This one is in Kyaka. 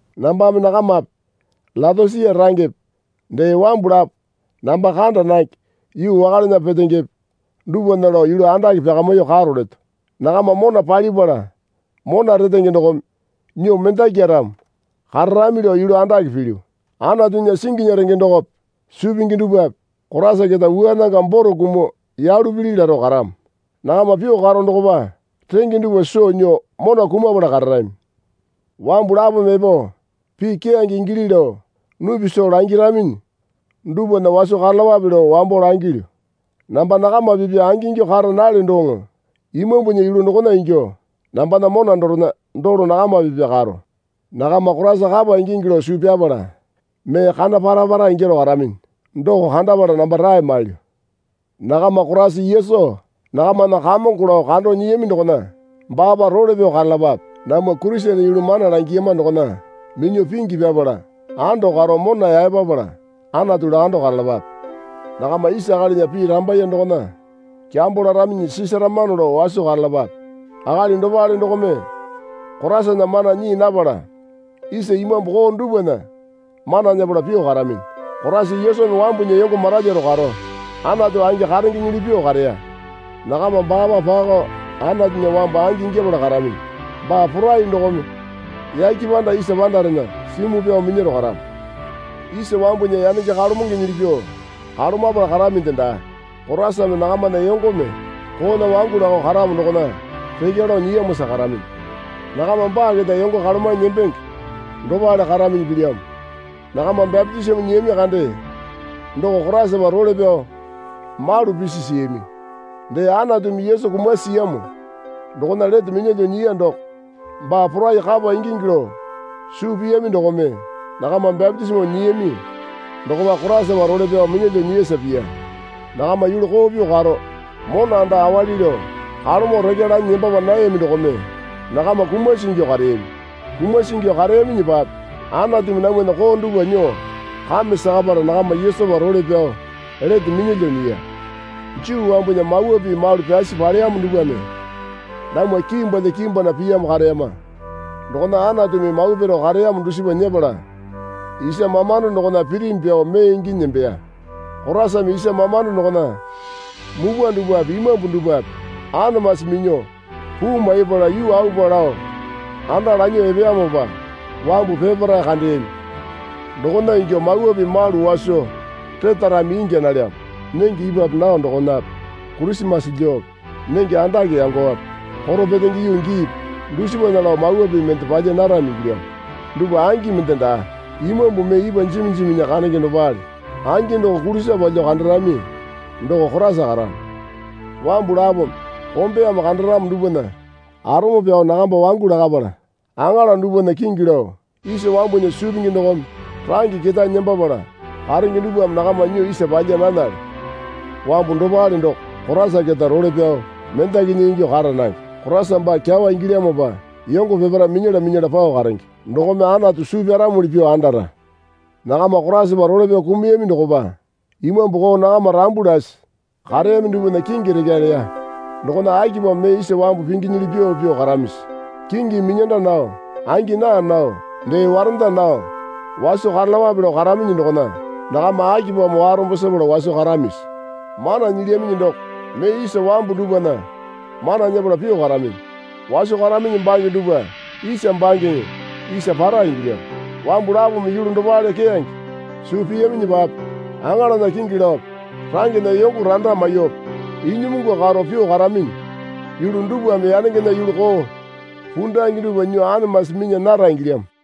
Nambame nakamape Leotosia rangepe dee wambu lapo namba kanda nange yuu wakalena petengepe dupwana lao yulu andake pyakamyuo karo leto. Nakama mona palipala mona retenge dokome nyuo mendakyaramo kararami lao yulu andake pilyu. Anatunya singinya renge dokope suu pingi dupwape Koraisa keta wua nanga boro kumuo yalu pili laro karamo. Nakama pyuo karo dokopa renge dupwa soo nyuo mona kumapala kararami. Wambu lapome epo pii keyange ingili lao nupi soo langiraminyi dupwana waso karalapape lao wambo langilyu. Namba nakama pipya angingyuo kara nalyo doŋo imambunya yulu dokona ingyuo nambana mona dorena dolo nakama pipa karo. Nakama Koraisa kapa ingingi lao suu pyapala mee kana para para ingyaro karaminyi doko kandapala namba rae mailyu. Nakama Koraisa Yesu nakamana Kamongo lao kando nyiyami dokona baapa role pyao karalapape. Namwa Kurisene yulu mana langiyama dokona minyuo pingi pyapala ando karo mona yaepapala Anatu lakando karalapape. Nakama isa akalinya pii rambaye dokona kyambo laraminyi sisaramano lao waso karalapape. Akali dopale dokome Koraisana mana nyii napala isa imambu koo dupwana mana nyepala pyuo karaminyi. Koraisa Yesumi wambunya yongo maralyuo karo, Anatu angi karengenyili pyuo kareya. Nakama baapa pakao Anatunya wambu angi ingyapala karaminyi. Baa porai dokome yake panda isa pandarena simuo pyao minyaro karamo. Isa wambunya yanenge kalomengenyili pyuo kalomapala karaminde daa. Koraisame nakamana yongome koona wangu lakao karamo dokona rekya lao nyiyamosa karaminyi. Nakama baa keta yongo kalomanyi nembenge dopale karaminyi pilyamo. Nakama bapitisimo nyiyami kande doko Koraisapa role pyao malu pisi siyami. Dee Anatumi Yesu kumasi siyamo dokona lete minyalyuo nyiya doko baa porai kapa ingingi lao suu piyami dokome nakama bapitisimo nyiyami dokopa Koraisapa role pyao minyalyuo nyiyasa piya. Nakama yulu koo pyuo karo mona anda awali lao kalomo rekya lanyi nembapa nayami dokome nakama kumasi ingyuo kareyami. Kumasi ingyuo kareyaminyipape Anatumi namwana koo dupwa nyuo kame sakapala nakama Yesupa role pyao lete minyalyuo nyiya. Juu wambunya mawa pii malu pyasi paleyamo dupwame namwa kimbwalya kimbwana piyamo kareyama. Dokona Anatumi mawa piro kareyamo dusipa nyepala isa mamando dokona pirimi pyao mee inginyi nembeya. Koraisame isa mamando dokona mupwa dupwape imambu dupwape anamasi minyuo puu maipala yuu aupa lao anda lanyuo epeyamopa wambu peparae kandeyami. Dokona ingyuo mawa pii malu waso retarami ingya nalyamo. Nenge ipwape nao dokonape Kurisimase lyuope nenge andake yangowape Koro Petenge yuu giipi dusipana lao mawa pii mende palya narami ingilyamo. Dupwa angi mende daa. Imambu mee ipwa jimi jiminya kandenge dopale. Angi doko kulisa palyuo kandarami doko Koraisa karamo. Wambu lapome kombeyame kandaramo dupwana arome pyao nakamba wangu lakapala aŋala dupwana kingi lao, isa wambunya suu pingi dokome range ketae nembapala karenge dupwame nakama nyuo isa palya nanale. Wambu dopale doko Koraisa keta role pyao mendakinya ingyuo kara nange. Koraisa baa kyawa ingilyamopa yongo peparae minyala minyala pao karenge. Dokome Anatu suu pyaramuli pyuo andara. Nakama Koraisapa role pyao kumuyami dokopa imambu koo nakama rambu lasi kareyami dupwana kingi rekya leya. Dokona akipamo mee isa wambu pinginyili pyuo pyuo karamisi? Kingimi minyanda nao, angi naa nao, dee warenda nao waso karalapape lao karaminyi dokona nakama akipamo warombo sepala waso karamisi? Mana nyilyaminyi doko mee isa wambu dupwana mana nyepala pyuo karaminyi. Waso karaminyi bange dupwa isa bangeŋe isa para ingilyamo. Wambu lapome yulu dopale keyange suu piyaminyipape aŋalana kingi laope rangena yongo randa maiyuope inyimungu karo pyuo karaminyi yulu dupwame yangengena yulu koo pundange dupwa nyuo anamasi minya nara ingilyamo.